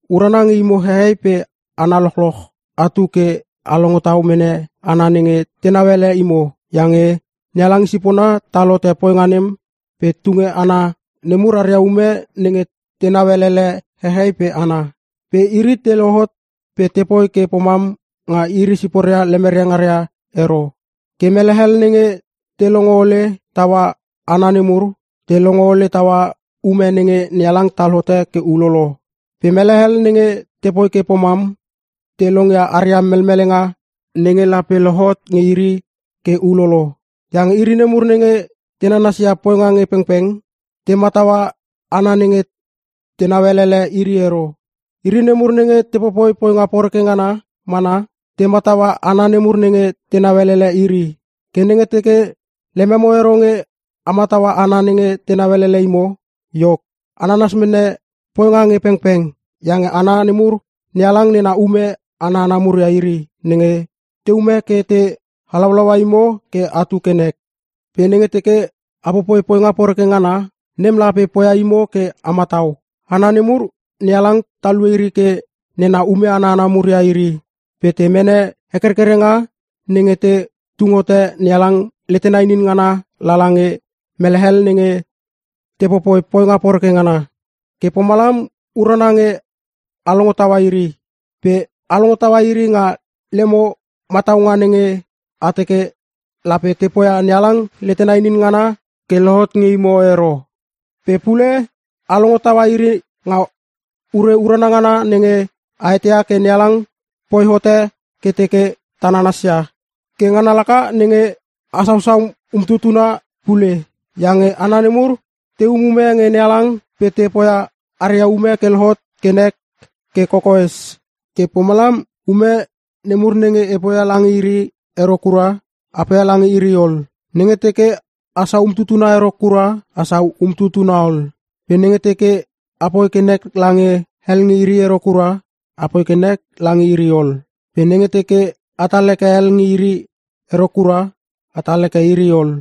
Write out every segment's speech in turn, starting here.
Urana nge imo hehei pe hana lochloch atu ke a longo tau mene hana nenge tenau ele imo, iange NeHalang i sipona tal hote poinga nem pe tunge hana nemur aria ume nenge tenau elele hehei pe hana. Pe iri te lohot pe tepoi ke pomam nga iri siporia lemeria ngaria ero. Ke mele hel nenge te longo ole taua hana nemur, te longo ole tau ume nenge NeHalang tal hote ke ulolo. Pe mele hel nenge tepoi ke pomam, te longia aria melmelenga nenge lape lohot nge iri ke ulolo. Iange iri nemur nenge te nanasia poinga nge pengpeng, te mataua hana nenge tenau elele iri ero. Iri nemur nenge te popoi poinga poreke ngana mana, te mataua hana nemur nenge tenau elele iri. Ke nenge teke lememo ero nge a mataua hana nenge tenau elele imo, iok, a nanas mene poinga nge pengpeng. Iange hana nemur, NeHalang nena ume ana hana mur ia iri, nenge teume ke te halaulaua imo ke atu ke nek. Pe nenge teke a popoi poinga poreke ngana, nem lape poia imo ke a matau. Hana nemur, NeHalang talue iri ke nena ume ana hana mur ia iri pe te mene hekerkerenga nenge te tung hote NeHalang letena inin ngana lala nge mele hel nenge te popoi poinga poreke ngana. Ke pomalam urana nge a longo taua iri. Pe a longo taua iri nga lemo mataunga nenge, a teke lape te poia NeHalang letena inin ngana ke lohot nge imo ero. Pe pule, a longo taua iri nga ure urana ngana nenge a eteia ke NeHalang poi hote ke teke ta nanasia. Ke ngana laka nenge a sausau umtutuna pule. Iange hana nemur te umume nge NeHalang pe te poia aria ume ke lohot ke nek ke kokoes. Ke pomalam ume nemur nenge a poia lange iri ero kura, a poia lange iri ol. Nenge teke asau umtutuna ero kura, asau umtutuna ol. Pe nenge teke a poi ke nek lange hel nge iri ero kura, apoi ke nek lange iri ol. Pe nenge teke atal heke hel nge iri ero kura atal heke iri ol.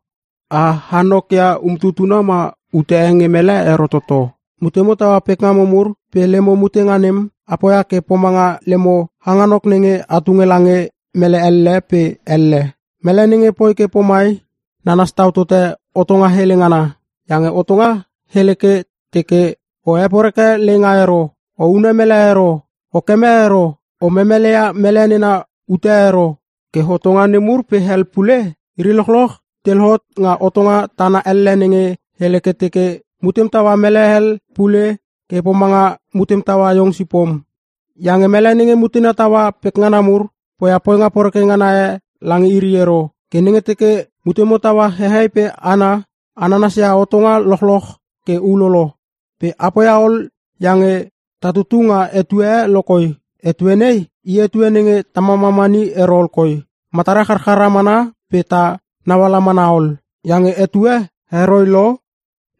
A hanok ia umtutuna ma ute e nge mele ero toto. Mutemo taua pekngamo mur pe lemo mutenga nem, a poia ke pomanga lemo hanganok nenge a tunge lange mele elle pe elle. Mele nenge poi ke pomai, nanas tau tote hotonga hele ngana. Iange hotonga hele ke teke, “O heporeke leinga ero,” “O hune mele ero,” “O keme ero,” “O memeleia mele nena ute e ero.” Ke hotonga nemur pe hel pule, iri lochloch te lohot nga hotonga tana elle nenge hele ke teke, “Mutem taua mele hel pule ke pomanga mutem taua iong sipom.” Iange mele nenge mutena taua pekngana mur, poia poinga poreke ngana e lange iri ero. Ke nenge teke mutemo taua hehei pe hana, a nanasia hotonga lochloch ke ulolo. Pe a poia ol iange ta tutu nga etue e lokoi. Etue nei i etue nenge ta mamamani ero ol koi, matara charchara mana pe ta nauala mana ol. Iange etue heroi lo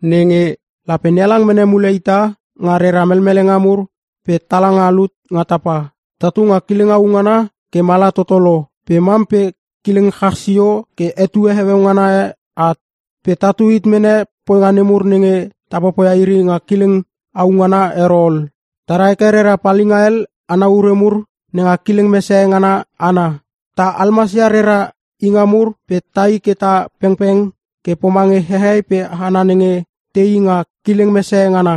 nenge lape NeHalang mene mule ita nga rera melmelenga mur pe tala nga lut nga tapa. Tatu nga kileng au ngana ke mala toto lo pe mam pe kileng chach sio ke etue heueu ngana e at. Pe tatu hit mene poinga nemur nenge ta popoia iri nga kileng au ngana ero ol. Ta ra heke rera palinga hel ana ure mur nenga kileng mesehe ngana ana. Ta almasia rera inga mur pe tai ke ta pengpeng ke pomange hehei pe hana nenge teii nga kileng mesehe ngana.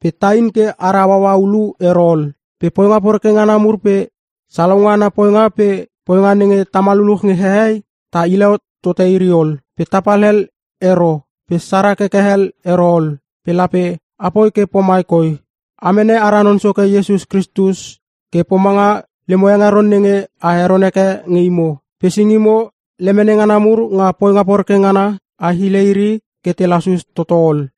Pe tain ke ara hauaua ulu ero ol. Pe poinga poreke ngana mur pe salaunga ana poinga pe poinga nenge tama lululuch nge hehei, ta hile tote iri ol. Pe tapal hel ero pe sara keke hel ero ol. Pe lape apoi ke pomai koi: A mene ara Non Soke Iesus Kristus ke pomanga lemo hengeron nenge a heron heke nge imo. Pe singimo lemene ngana mur nga poinga poreke ngana, a hile iri ke te lasus toto ol.